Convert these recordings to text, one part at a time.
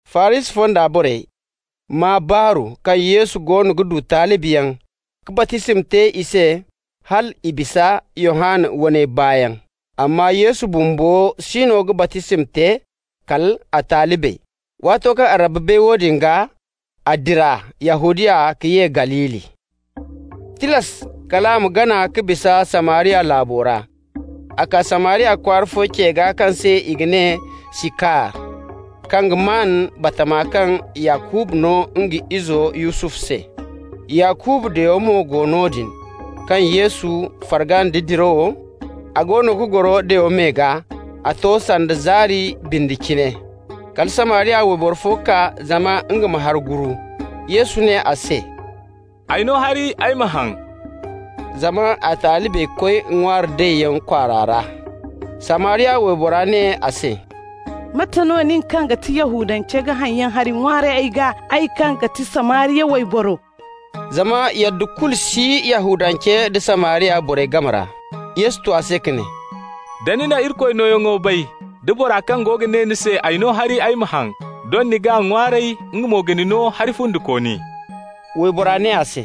Farisi fonda borey maa baaru kaŋ Yesu goono ga du talibiyaŋ ka baptisma te i se hal i bisa Yohanna waney baayaŋ. (Amma Yesu bumbo siino ga baptisma te, kal a talibey.) Waato kaŋ Rabbi bay woodin gaa, a dira Yahudiya ka ye Galili. Tilas kal a ma gana ka bisa Samariya laabo ra. A kaa Samariya kwaara fo ce gaa kaŋ se i ga ne Sikar, kaŋ ga maan batama kaŋ Yakuba no nga izo Yusufu se. Yakuba dayo mo go noodin. Kaŋ Yesu farga nda dirawo, a goono ga goro dayo me gaa. A to sanda zaari bindi cine. Kala Samariya wayboro fo kaa zama nga ma hari guru. Yesu ne a se: «Ay no hari ay ma haŋ.» (Zama a talibey koy ŋwaari dayyaŋ kwaara ra.) Samariya waybora ne a se: «Mate no nin kaŋ ga ti Yahudance ga haŋyaŋ hari ŋwaaray ay gaa, ay kaŋ ga ti Samariya wayboro?» (Zama yadda kulu si Yahudancey da Samariya borey game ra.) Yesu tu a se ka ne: «Da ni na Irikoy nooyaŋo bay da bora kaŋ go ga ne ni se: ‹Ay no hari ay ma haŋ›, doŋ ni g'a ŋwaaray, nga mo ga ni no hari fundikooni.» Waybora ne a se: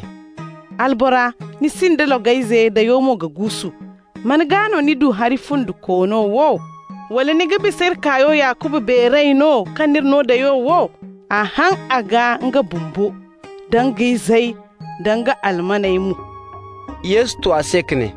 «Albora, ni sinda logayze, dayo mo ga guusu. Man gaa no ni du hari fundikoono wo? Wala ni ga bisa iri kaayo Yakuba beeray no, kaŋ n'iri no dayo wo? A haŋ a gaa nga bumbo, da nga izey, da nga almaney mo.» Yesu tu a se ka ne: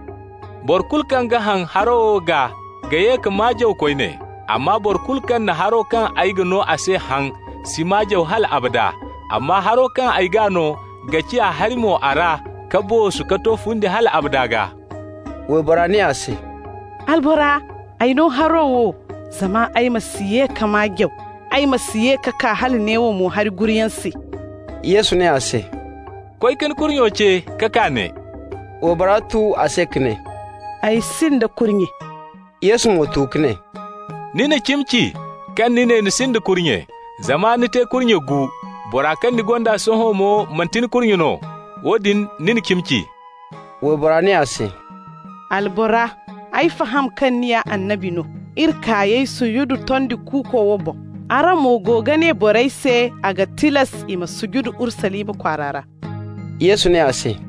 «Boro kulu kaŋ ga haŋ haro wo gaa ga ye ka maa jaw koyne. Amma boro kulu kaŋ na haro kaŋ ay ga no a se haŋ si maa jaw hal abada, amma haro kaŋ ay g'a no ga ciya hari-mo a ra ka boosu ka to fundi hal abada gaa.» Waybora ne a se: «Albora, ay no haro wo, zama ay ma si ye ka maa jaw, ay ma si ye ka kaa hala neewo mo hari guruyaŋ se.» Yesu ne a se: «Koy ka ni kurnyo ce ka kaa ne.» Waybora tu a se ka ne: «Ay sinda kurnye.» Yesu mo tu ka ne: «Ni na cimi ci kaŋ ni ne ni sinda kurnye, zama ni te kurnye gu. Bora kaŋ ni gonda sohõ mo, manti ni kurnye no. Woodin, ni na cimi ci.» Waybora ne a se: «Albora, ay faham kaŋ ni ya annabi no. Iri kaayey sududu tondi kuuko wo boŋ. Araŋ mo go ga ne borey se, a ga tilas i ma sududu Urusalima kwaara ra.» Yesu ne a se: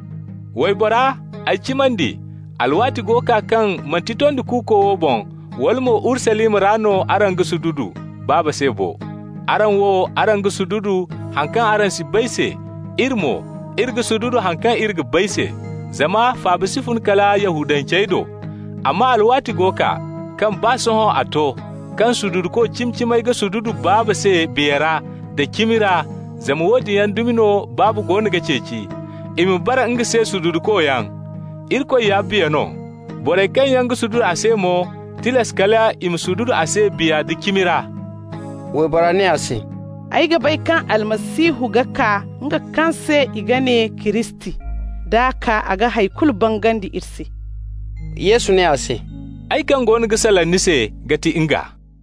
«Waybora, ay cimandi, alwaati go kaa kaŋ manti tondi kuuko wo boŋ wala mo Urusalima ra no araŋ ga sududu Baaba se bo. Araŋ wo, araŋ ga sududu haŋ kaŋ araŋ si bay se. Iri mo, iri ga sududu haŋ kaŋ iri ga bay se, zama faaba si fun kala Yahudancey do. Amma alwaati go kaa, kaŋ baa sohõ a to, kaŋ sududuko cimi-cimey ga sududu Baaba se biya ra nda cimi ra, zama woodin yaŋ dumi no Baaba goono ga ceeci i ma bara nga se sududukoyaŋ. Irikoy ya biya no. Borey kaŋ yaŋ ga sududu a se mo, tilas kal i ma sududu a se biya da cimi ra.» Waybora ne a se: «Ay ga bay kaŋ Almasihu ga kaa, nga kaŋ se i ga ne Kiristi. D'a kaa, a ga hay kulu bangandi iri se.» Yesu ne a se: «Ay kaŋ goono ga salaŋ ni se ga ti nga.»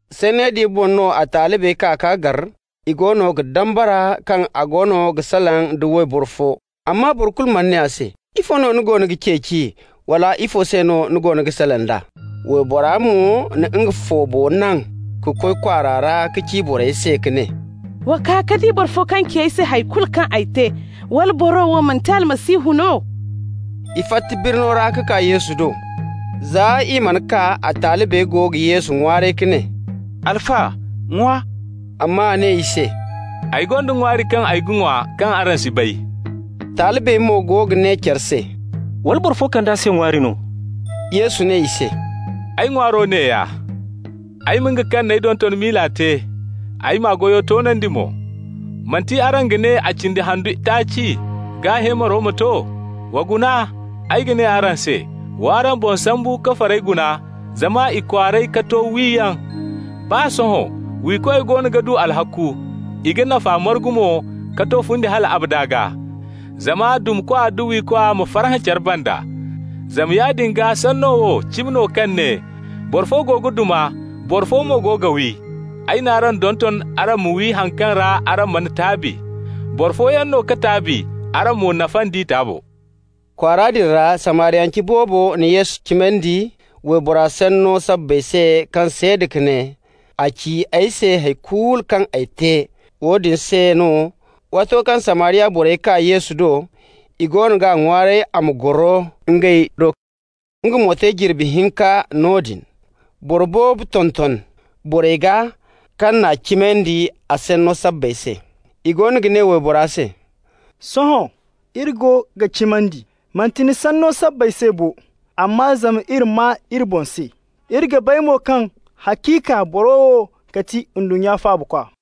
Sanney din boŋ no a talibey kaa k'a gar. I goono ga dambara kaŋ a go ga salaŋ da wayboro fo, amma boro kulu mana ne a se: «Ifo no ni goono ga ceeci?» wala: «Ifo se no ni go ga salaŋ d'a?» Waybora mo na nga foobo naŋ ka koy kwaara ra ka ci borey se ka ne: «Wa kaa ka di boro fo kaŋ ci ay se hay kulu kaŋ ay te! Wala boro wo manti Almasihu no?» I fatta birno ra ka kaa Yesu do. Za i mana kaa, a talibey go ga Yesu ŋwaaray ka ne: «Alfa, ŋwa!» Amma a ne i se: «Ay gonda ŋwaari kaŋ ay ga ŋwa kaŋ araŋ si bay.» Talibey mo go ga ne care se: «Wala boro fo kand'a se ŋwaari no?» Yesu ne i se: «Ay ŋwaaro neeya: ay ma nga kaŋ n'ay donton miila te, ay m'a goyo toonandi mo. Manti araŋ ga ne a cindi handu taaci, gaa heemaro ma to? Wa guna, ay ga ne araŋ se: w'araŋ boŋ sambu ka farey guna zama i kwaaray ka to wiyaŋ. Baa sohõ wiikoy goono ga du alhakku, i ga nafa margu mo ka to fundi hal abada gaa, zama dumakwa da wiikwa ma farhã care banda. Zama yaadin gaa sanno wo cimi no kaŋ ne: ‹Boro fo go ga duma, boro fo mo go ga wi.› Ay n'araŋ donton araŋ ma wi haŋ kaŋ ra araŋ mana taabi. Boro fooyaŋ no ka taabi, araŋ mo nafa nd'i taabo.» Kwaara din ra Samariyance boobo na Yesu cimandi waybora sanno sabbay se kaŋ seeda ka ne: «A ci ay se hay kulu kaŋ ay te.» Woodin se no, waato kaŋ Samariya borey kaa Yesu do, i goono g'a ŋwaaray a ma goro ngey do. Nga mo te jirbi hinka noodin. Boro boobo tonton borey gaa kaŋ n'a cimandi, a sanno sabbay se. I goono ga ne waybora se: «Sohõ iri go ga cimandi, manti ni sanno sabbay se bo, amma zama iri maa iri boŋ se. Iri ga bay mo kaŋ haciika boro wo ga ti ndunnya Faabakwa.»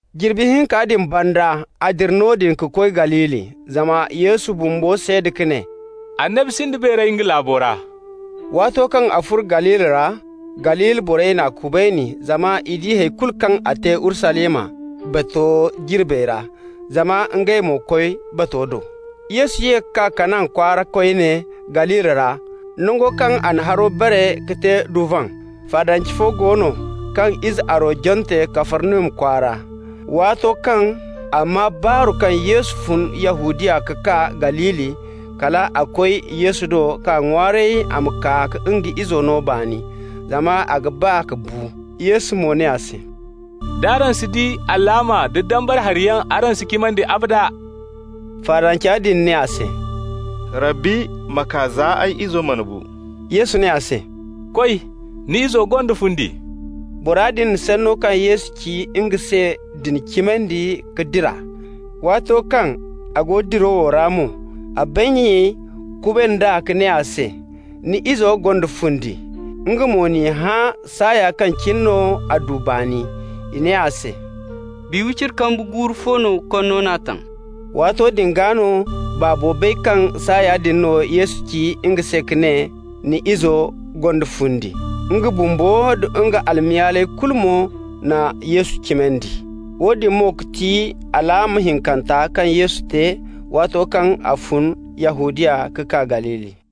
Jirbi hinka din banda a dira noodin ka koy Galili. Zama Yesu bumbo seeda ka ne: «Annabi sinda beeray nga laabo ra.» Waato kaŋ a furo Galili ra, Galili borey n'a kubayni, zama i di hay kulu kaŋ a te Urusalima, bato jirbey ra, zama ngey mo koy bato do. Yesu ye ka kaa Kana kwaara koyne Galili ra, nango kaŋ a na haro bare ka te duvan. Faadance fo go no kaŋ ize aro jante Kafarnahum kwaara. Waato kaŋ a maa baaru kaŋ Yesu fun Yahudiya ka kaa Galili, kal a koy Yesu do k'a ŋwaaray a ma kaa ka nga izo no baani, zama a ga ba ka bu. Yesu mo ne a se: «D'araŋ si di alaama da dambara hariyaŋ araŋ si cimandi, abada.» Faadanca din ne a se: «Rabbi, ma kaa za ay izo mana bu!» Yesu ne a se: «Koy! Ni izo gonda fundi.» Bora din na sanno kaŋ Yesu ci nga se din cimandi ka dira. Waato kaŋ a go dirawo ra mo, a bannyey kuband'a ka ne a se: «Ni izo gonda fundi!» Nga mo n'i hã saaya kaŋ cine no a du baani. I ne a se: «Bi wiciri kambu guuru fo no konno n'a taŋ.» Waato din gaa no baabo bay kaŋ saaya din no Yesu ci nga se ka ne: «Ni izo gonda fundi.» Nga bumbo da nga almayaaley kulu mo na Yesu cimandi. Woodin mo no ga ti alaama hinkanta kaŋ Yesu te waato kaŋ a fun Yahudiya ka kaa Galili.